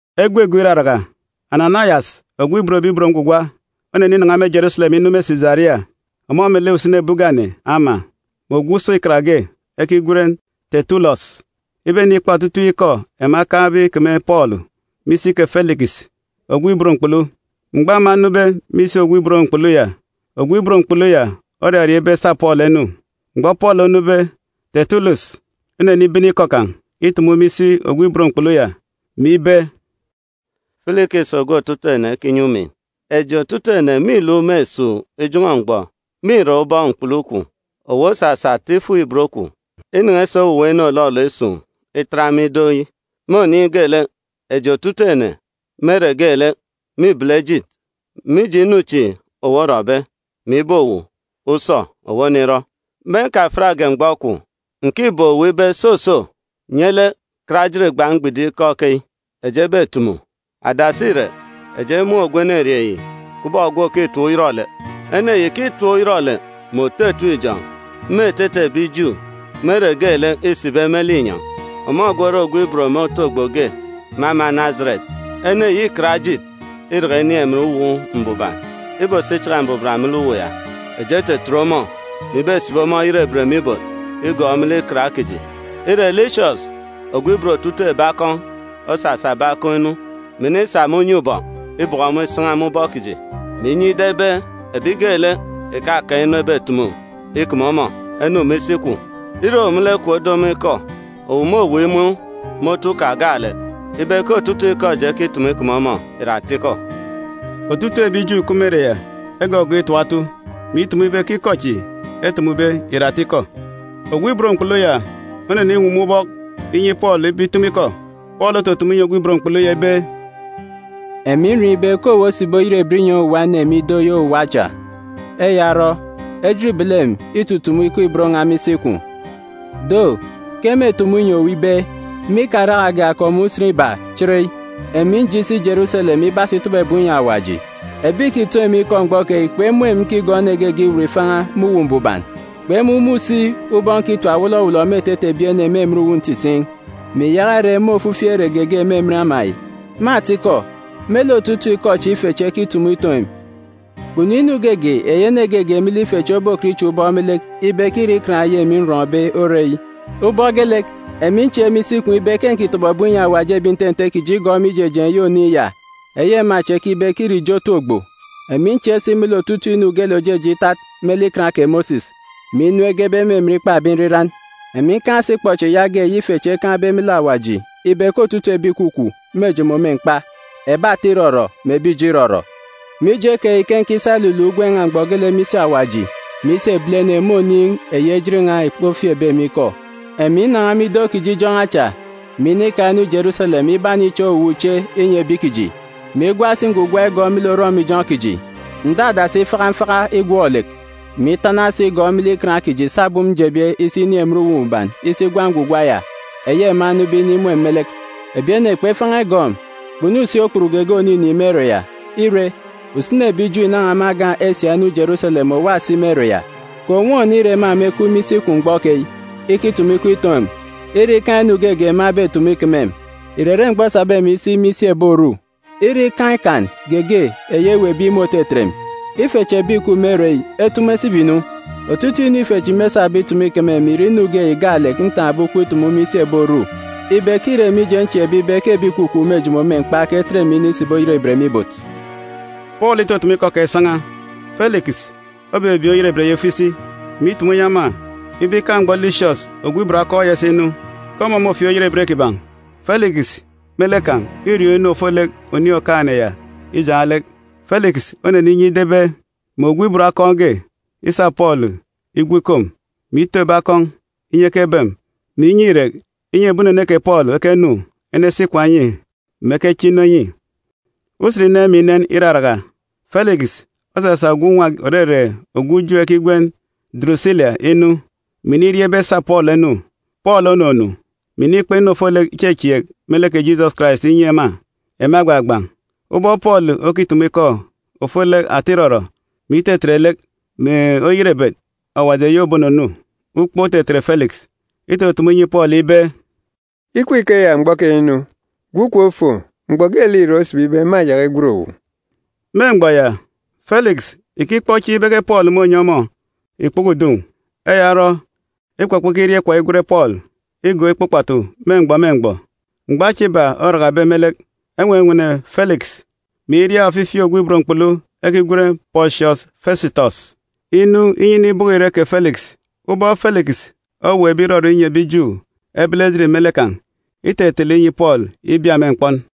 Usen go iraraka, Ananayas ogwu òban Awaji oneninan̄a me Jeruselem inu me Sisaria, ọmọ melek usini ebi ugane ama, mè ogwu usọ ikan ge ekigwen Tetulọs, ibenikpa otutuuk ikọ ema ekaan̄be ikeme Pọọlu me isi kè Filikis ogwu ibot mkpulu. Mgbọ ema enube me isi ogwu ibot mkpulu ya, ogwu ibot mkpulu ya oraria ibe esa Pọọlu enu. Mgbọ Pọọlu onube, Tetulọs onenibene ikọ kan̄ itumu me isi ogwu ibot mkpulu ya, mè ibe, “Filikis ogwu otutuuk ene ekinyi umin! Eji otutuuk ene mîluk me esuuk ijọn̄ọ mgbọ me irak ubọk mkpulu kwun̄. Owu osasa ata ifuk-ibot kwun̄ inen̄e si owuwa inu òlọlọ isun̄ itat me ido yi. Me oniin̄ geelek, eji otutuuk ene me ere geelek mîbele ejit, mije inu chi owu orọbe, mè ibe owu, usọ! Owu onirọ! Me nkafiatge mgbọ kwun̄, ǹkibeek owu ibe, soso, nye lek kat ejit gban̄ mgbidim ikọ keyi eji ebetumu. “Adasi irek, eji emun̄ ogwu enerieen̄ yi kubọk ogwu òkitap uyọrọlek. Ene yi ìkitap uyọrọlek, mè òto etim ijọn̄ me etete ebi Ju me ere geelek îsibe me linyọn̄. Ọmọ gwu ore ogwu ibot me otu ogbo ebi ìkigọọk ogwu Najeret ge. Ene yi îkat ejit iraka inin̄ emen Uwu Mbuban ibosi ichaka mbuban me lek uwu ya. Eji etetet ọmọ, [mè ibesibi ọmọ oyerebet me ibot igọọk me lek Ikan kiji. Ire, Lisias ogwu ibot otutuuk ebi akọn̄ osasa ebi akọn̄ inu, mè inisa me unye ubọk ibọkọ ọmọ isan̄a me ubọk kiji, mè inyi ida ibe ebi geelek ìkakaan̄ inu ebetumu ikeme ọmọ enu me isi kwun̄.] Ire owu me lek kwun̄ odo ọmọ ikọ, owu môweek imun̄ me otu kan̄ gaalek ibe ke otutuuk ikọ eji ekitumu ikeme ọmọ ìre atikọ.” Otutuuk ebi Ju ìkup me ere ya egọgọọk itap otu, mè itumu ibe ke ikọ chi etumube ìre atikọ. Ogwu ibot mkpulu ya oneniwuwum ubọk inyi Pọọlu ibe itumu ikọ. Pọọlu otutumu inyi ogwu ibot mkpulu ya ibe, “Emi nriọọn̄ ibe ke owu osibi oyerebet inyi owuwa ene me ido yi owuwa acha. Eya orọ, ejit îbele emi itutumu ikọ ibot n̄a me isi kwun̄. Do, ke mêtumu inyi owu ibe, me ikarakage akọp mè usen iba chereyi, emi nje isi Jeruselem ibasi itọbọ ebum inyi Awaji. Ebi ìkitoon̄ emi ikọ mgbọ keyi kpemun̄ emi nkigọọk ene geege iwut ifan̄a me Uwu Mbuban, kpemumun̄ si ubọk nkitap wọlọwọlọ me etete ebi ene me emen uwu ntitiin̄, mè ìyaka ire me ofifi ere geege me emen ama yi. Me atikọ, me lek otutuuk ikọ chi ife chi ekitumu itoon̄ emi, kpunu inu geege eyi ene geege me lek ife chi obokọt ichak ubọk me lek ibe ke îre ikan eyi emi nrọn̄be ire eyi. Ubọk geelek, emi nchieek me isi kwun̄ ibe ke ǹkitọbọ ebum inyi Awaji ebi nte nte kiji igọọk me ijejeen̄ eyi Oniin̄ ya eyi ema chi ekibe ke îre ijo otu ogbo. Emi nchieek si me lek otutuuk inu geelek òjeje itat me lek Ikan kè Mosis, mè inu egebe me emen ikpa ebi nriran. Emi ǹkaan̄ si ikpọchieen̄ yaage eyi ife chi ekaan̄be me lek Awaji ibe ke otutuuk ebi ìkwakwaan̄ mêjomo me mkpa, ebi ata irọrọ mè ebi ijo irọrọ. Mije keyi ke nkisa iluluk ugwem n̄a mgbọ geelek me isi Awaji mè isi ebilene me oniin̄ eyi ejit n̄a kpofieekbe emi ikọ. “Emi nnan̄a me ido kiji ijọn̄ọ acha, mè inika inu Jeruselem ibaniche owuwa uche inyi ebi kiji, mè igwa si ngwugwa igọọk me lek orọmijọn̄ kiji. Ǹdadasi ifaka mfaka igwọk-lek, mè itana si igọọk me lek Ikan kiji sabum njebe isi inin̄ emen Uwu Mbuban isi igwa ngwugwa ya, eyi ema enube inimun̄ emi me lek. Ebi ene kpefan̄a igọọk emi, kpunu si okput geege òninin̄ me ere ya. Ire, usini ebi Ju ìnan̄a me agan̄ Esia inu Jeruselem òwa si me ere ya. Kè ònwọn ire ema mekup me isi kwun̄ mgbọ keyi, ikitumu ikọ itoon̄ emi, ire ke îkaan̄ inu ge ema ebetumu ikeme emi. Ìrere mgbọ esabe emi isi me isi ebi Oru, ire ikaan̄ ikan ge eyi eweekbe imun̄ òtetet emi, ife chi ebi ìkup me ere yi etumu esibi-nu. Otutuuk inu ife chi mêsabe itumu ikeme emi ìre inu ge yi gaalek ntaan̄be ukpo itumu me isi ebi Oru ibe ke îre mije nchieekbe ibe ke ebi ìkwakwaan̄ mêjomo me mkpa ke etet emi inisibi oyerebet me ibot.” Pọọlu itutumu ikọ kan̄ isan̄a, Filikis obebieen̄ oyerebet ya ifo isi, mè itumu inyi ema ibe ikaan̄ mgbọ Lisias ogwu ibot akọn̄ ya isinu, ke ọmọ môfieek oyerebet kiban̄. Filikis me lek kan̄ îriọọn̄ inu ofolek Oniin̄ Okaan̄-ene ya ijaan̄ lek. Filikis oneninyi ida ibe mè ogwu ibot akọn̄ ge isa Pọọlu igwu ikom, mè ito ebi akọn̄, inyi ekebem, mè inyi irek, inyi ebi unene kè Pọọlu ekenu enesi ikwaan̄ enyi, mè ekeche inu enyi. Usen inen mè inen iraraka, Filikis osasa ogwu nwa, òrere ogwu Ju, ekigwen Durusila, inu, mè iniria ibe esa Pọọlu enu. Pọọlu onunu, mè inikpa inu ofolek ichechieek me lek kè Jisọs Karais inyi ema, ema egbagban̄. Ubọk Pọọlu okitumu ikọ ofolek ata irọrọ, mè itetet lek, mè oyerebet Awaji eyi òbonunu, ukpook otetet Filikis. Itutumu inyi Pọọlu ibe, “Ikup ikeya mgbọ keyi nu! Gwu kom fo! Mgbọ geelek irek osibibe, mâyaka igwen owu.” Me mgbọ ya, Filikis ìkikpọ chieen̄ ibe ke Pọọlu mônyi ọmọ ikpoko udun̄. Eya orọ ikpọkpọ ikiria ikwaan̄ igwen Pọọlu igọọk ikpa ukpatu me mgbọ me mgbọ. Mgbọ acha iba orakabe me lek, enwenwene Filikis, mè iria ofifi ogwu ibot mkpulu ekigwen Pọsiọs Fesitọs inu inyi inibọkọ irek kè Filikis. Ubọk Filikis oweekbe irọrọ inyi ebi Ju ebele ejit melek kan̄, itetele inyi Pọọlu ibia me mkpọn.